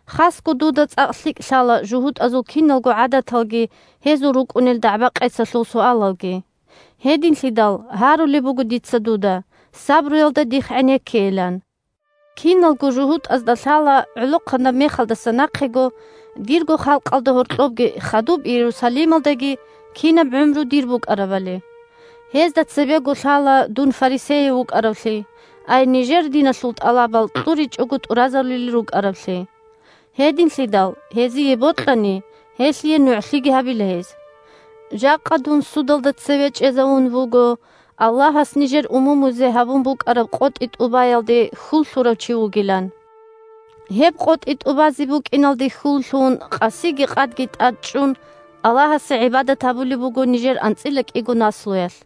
Хасго дуда цӀакъ лъикӀ лъала жугьутӀазул киналго гӀадаталги гьезул рукӀунел дагӀба-къецалъул суалалги. Гьединлъидал гьарулеб буго дица дуда сабруялда дихъ гӀенеккейилан. Киналго жугьутӀазда лъала гӀолохъанаб мехалдаса нахъего дирго халкъалда гьоркьобги хадуб Иерусалималдаги кинаб гӀумру дир букӀарабали. Гьезда цебего лъала дун фарисеяв вукӀаравлъи, ай нижер диналъул тӀалабал кьуричӀого тӀуразарулел рукӀараблъи. Гьединлъидал, гьезие бокьани, гьелъие нугӀлъиги гьабила гьез. Жакъа дун судалда цеве чӀезавун вуго Аллагьас нижер умумузе гьабун букӀараб къотӀи тӀубаялде хьул лъурав чи вугилан. Гьеб къотӀи тӀубазе букӀиналде хьул лъун къасиги къадги тӀадчӀун Аллагьасе гӀибадат гьабулеб буго нижер анцӀила кӀиго наслуялъ.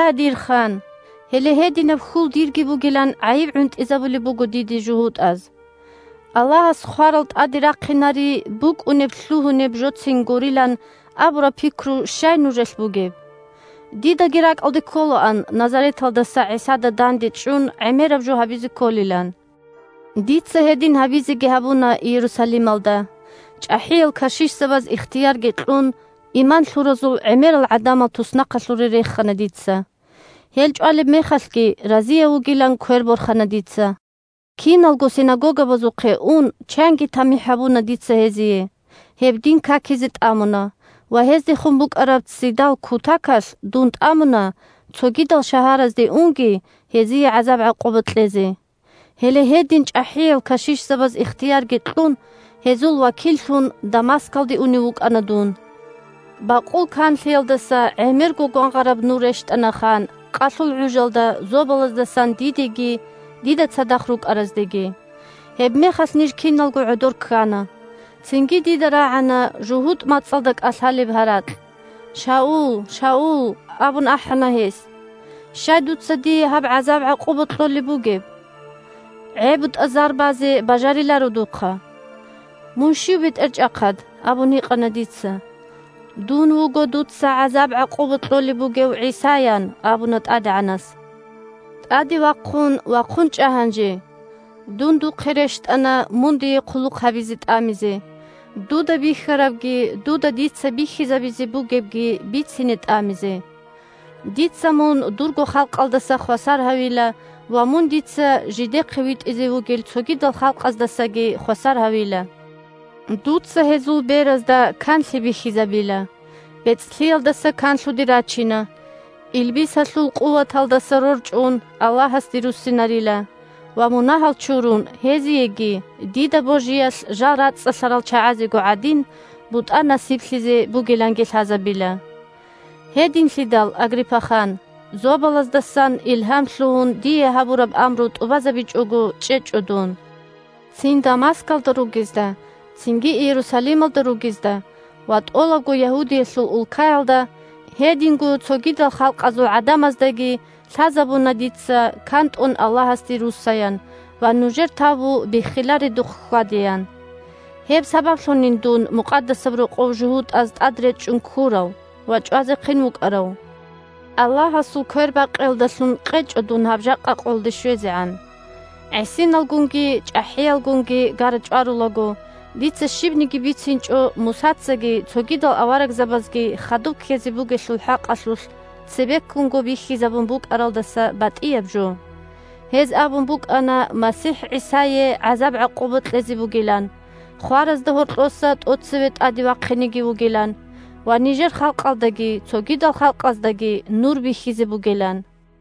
Я дир хан, гьеле гьединаб хьул дирги бугилан гӀайиб гӀунтӀизабулеб буго диде жугьутӀаз. Аллагьас хварал тӀаде рахъинари букӀунеб-лъугьунеб жоцин гурилан абураб пикру щай нужелъ бугеб? Дидаги ракӀалде кколаан Назареталдаса ГӀисада дандечӀун гӀемераб жо гьабизе кколилан. Дица гьедин гьабизеги гьабуна Иерусалималда, чӀахӀиял кашишзабаз ихтиярги кьун, иман лъуразул гӀемерал гӀадамал туснахъалъуре рехана дица. Гьел чӀвалеб мехалъги, разияв вугилан квер борхана дица. Киналго синагогабазухъе ун, чанги тамихӀ гьабуна дица гьезие, гьеб дин какизе тӀамуна ва гьездехун букӀараб ццидал кутакалъ дун тӀамуна, цогидал шагьаразде унги, гьезие гӀазаб-гӀакъуба кьезе. «Дида кӀвечӀо зобалаздасан гьабураб амру тӀубазабичӀого чӀезе» Гьеле гьедин чӀахӀиял кашишзабаз ихтиярги кьун, гьезул вакиллъун Дамаскалде унев вукӀана дун. Бакъул канлъиялдаса гӀемерго гвангъараб нур рещтӀана, хан, къалъул гӀужалда зобалаздасан дидеги дида цадахъ рукӀараздеги. Гьебмехалъ ниж киналго гӀодор ккана. Цинги дида рагӀана жугьутӀ мацӀалда кӀалъалеб гьаракь. «Шаул! Шаул! – абун ахӀана гьес. – Щай дуца дие гьаб гӀазаб-гӀакъуба кьолеб бугеб? ГӀебутӀа зар базе бажариларо духъа». «Мун щив, бетӀерчӀахъад?» – абун гьикъана дица. «Дун вуго дуца гӀазаб-гӀакъуба кьолеб бугев ГӀиса, – ян абуна ТӀадегӀанас. – ТӀаде вахъун, вахъун чӀа гьанже! Дун духъе рещтӀана, мун дие хъулухъ гьабизе тӀамизе, дуда бихьарабги дуда дица бихьизабизе бугебги бицине тӀамизе. Дица мун дурго халкъалдаса хвасар гьавила ва мун дица жидехъе витӀизе вугел цогидал халкъаздасаги хвасар гьавила. Дуца гьезул беразда канлъи бихьизабила, бецӀлъиялдаса канлъуде рачина, илбисалъул къуваталдаса рорчӀун Аллагьасде руссинарила ва, мунагьал чурун, гьезиеги, дида божиялъ жал рацӀцӀалъарал чагӀазего гӀадин, бутӀа насиблъизе бугиланги лъазабила». Гьединлъидал, Агриппа хан, зобалаздасан илгьам лъугьун дие гьабураб амру тӀубазабичӀого чӀечӀо дун. Цин Дамаскалда ругезда, цинги Иерусалималда ругезда ва тӀолабго Ягьудиялъул улкаялда, гьединго цогидал халкъазул гӀадамаздаги лъазабуна дица кантӀун Аллагьасде руссаян ва нужер тавбу биххиларедухъ хьвадеян. Гьеб сабаблъунин дун Мукъадасаб Рокъов жугьутӀаз тӀад речӀчӀун ккурав ва чӀвазехъин вукӀарав. Аллагьасул квербакъиялдалъун къечӀо дун гьаб жакъа къоялде щвезегӀан. ГӀисиналгунги чӀахӀиялгунги гара-чӀварулаго, дица щибниги бицинчӀо Мусацаги цогидал аварагзабазги хадуб ккезе бугелъул хӀакъалъулъ цебеккунго бихьизабун букӀаралдаса батӀияб жо. Гьез абун букӀана МасихӀ ГӀисае гӀазаб-гӀакъуба кьезе бугилан, хваразда гьоркьоса тӀоцеве тӀаде вахъинеги вугилан ва нижер халкъалдаги цогидал халкъаздаги Нур бихьизе бугилан.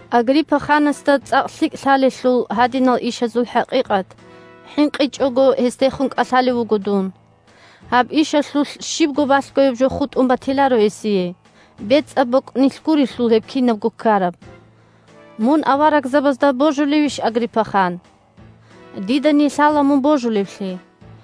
Агриппа ханасда цӀакъ лъикӀ лъалелъул гьадинал ишазул хӀакъикъат, хӀинкъичӀого гьесдехун кӀалъалев вуго дун. Гьаб ишалъулъ щибго балъгояб жо хутӀун батиларо гьесие, бецӀаб бокӀнилъ гурелъул гьеб кинабго ккараб. Мун аварагзабазда божулевищ, Агриппа хан? Дидани лъала мун божулевлъи.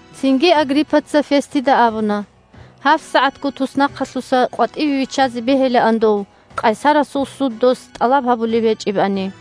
Цинги Агриппаца Фестида абуна: – ГьабсагӀатго туснахъалъуса къватӀиве виччазе бегьилаан дов, къайсарасул суд дос тӀалаб гьабулеб гьечӀебани.